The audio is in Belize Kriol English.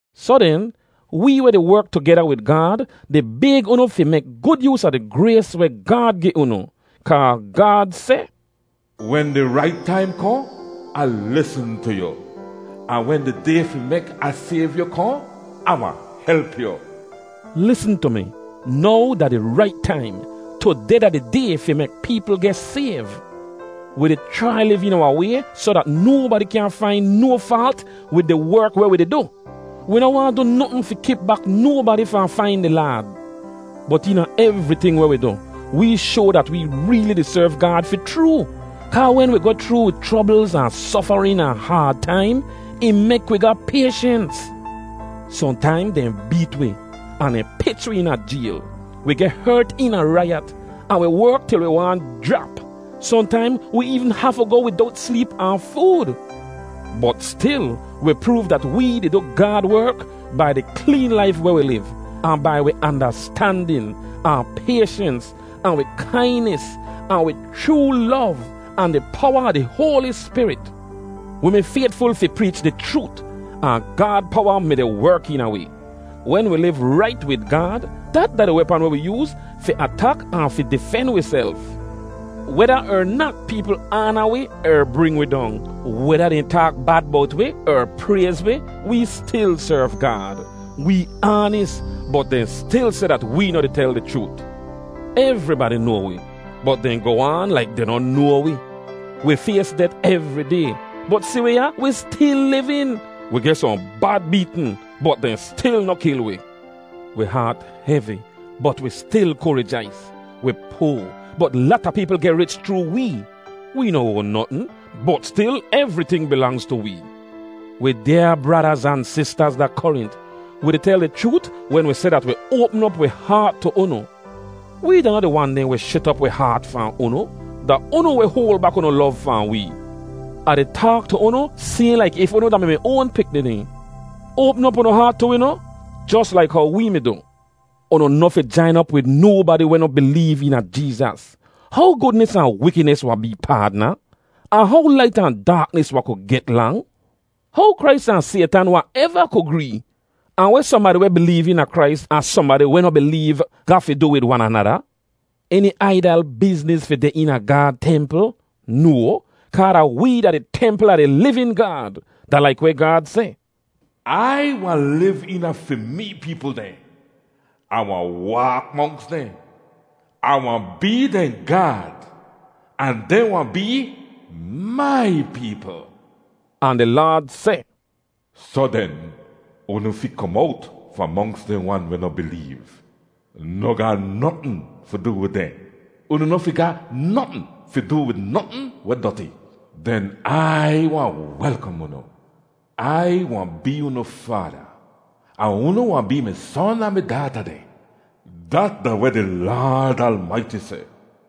Soh den, wee weh di werk tugeda wid Gaad di bayg unu fi mek gud yoos a di grays weh Gaad gi unu. Kaa Gaad seh, “Wen di rait taim kohn, Ah lisn tu yu, ahn wen di day fi mek Ah sayv yu kohn, Ah wahn help yu.” Lisn tu mi; now da di rait taim. Tudeh da di day fi mek peepl geh sayv! Wi di chrai liv eena wahn way soh dat nobadi kyaahn fain no faalt wid di werk weh wi di du. Wi noh waahn du notn fi kip bak nobadi fahn fain di Laad. Bot eena evriting weh wi du, wee shoa dat wee reeli di serv Gaad fi chroo, kaa wen wi goh chroo wi chroblz ahn sofarin ahn haad taim, ih mek wi ga payshens. Sohntaim dehn beet wi, ahn dehn pich wi eena jayl; wi geh hert eena raiyat, ahn wi werk til wi waahn jrap; sohntaim wi eevn hafu goh widowt sleep ahn food. Bot stil, wi proov dat wee di du Gaad werk bai di kleen laif weh wi liv, ahn bai wi andastandin, ahn payshens, ahn wi kainis ahn wi chroo lov, ahn di powa a di Hoali Spirit. Wi mi faytful fi preech di chroot, ahn Gaad powa mi-di werk eena wi. Wen wi liv rait wid Gaad, dat da wi wepan weh wi yooz fi atak ahn fi difen wiself. Weda er nat peepl aana wi er bring wi dong, weda dehn taak bad bowt wi er prayz wi, wee stil serv Gaad. Wee aanis, bot dehn stil seh dat wee noh di tel di chroot. Evribadi noa wi, bot dehn goh aan laik dehn noh noa wi. Wi fays det evri day, bot si wi ya, wi stil livin. Wi geh sohn bad beetn, bot dehn stil noh kil wi. Wi haat hevi, bot wi stil ku rijais. Wi poa, bot lata peepl geh rich chroo wee. Wee noh oan notn, bot stil evriting bilangz tu wee. Wi dyaa bradaz ahn sistaz da Korint, wi di tel di chroot wen wi seh dat wi oapm op wi haat tu unu. Wee da noh di wan dehn weh shet op wi haat fahn unu; da unu weh hoal bak unu lov fahn wee. Ah di taak tu unu sayhn laik if unu da-mi mi oan pikni dehn. Oapm op unu haat tu wi noh, jos laik how wee mi du. Unu noh fi jain op wid nobadi weh noh bileev eena Jeezas. How gudnis ahn wikidnis wahn bee paadna? Ahn how lait ahn daaknis wahn ku get lang? How Krais ahn Saytan wahn eva ku gree? Ahn weh sohnbadi weh bileev eena Krais ahn sohnbadi weh noh bileev ga fi du wid wan anada? Eni aidal bizniz fi deh eena Gaad templ? No, kaa da wee da di templ a di livin Gaad. Da laik weh Gaad seh, “Ai wahn liv eena fi mee peepl dehn. Ah wahn waak monks dehn. Ah wahn bee dehn Gaad, ahn dehn wahn bee mai peepl.” Ahn di Laad seh, “Soh den, unu fi kom owt fahn monks dehn wan weh noh bileev. Noh ga notn fi du wid dehn. Unu noh fi ga notn fi du wid notn weh doti. Den Ai wahn welkom unu.” “Ai wahn bee unu Faada, ahn unu wahn bee mi son ahn mi daata dehn. Dat da weh di Laad Almaiti seh.”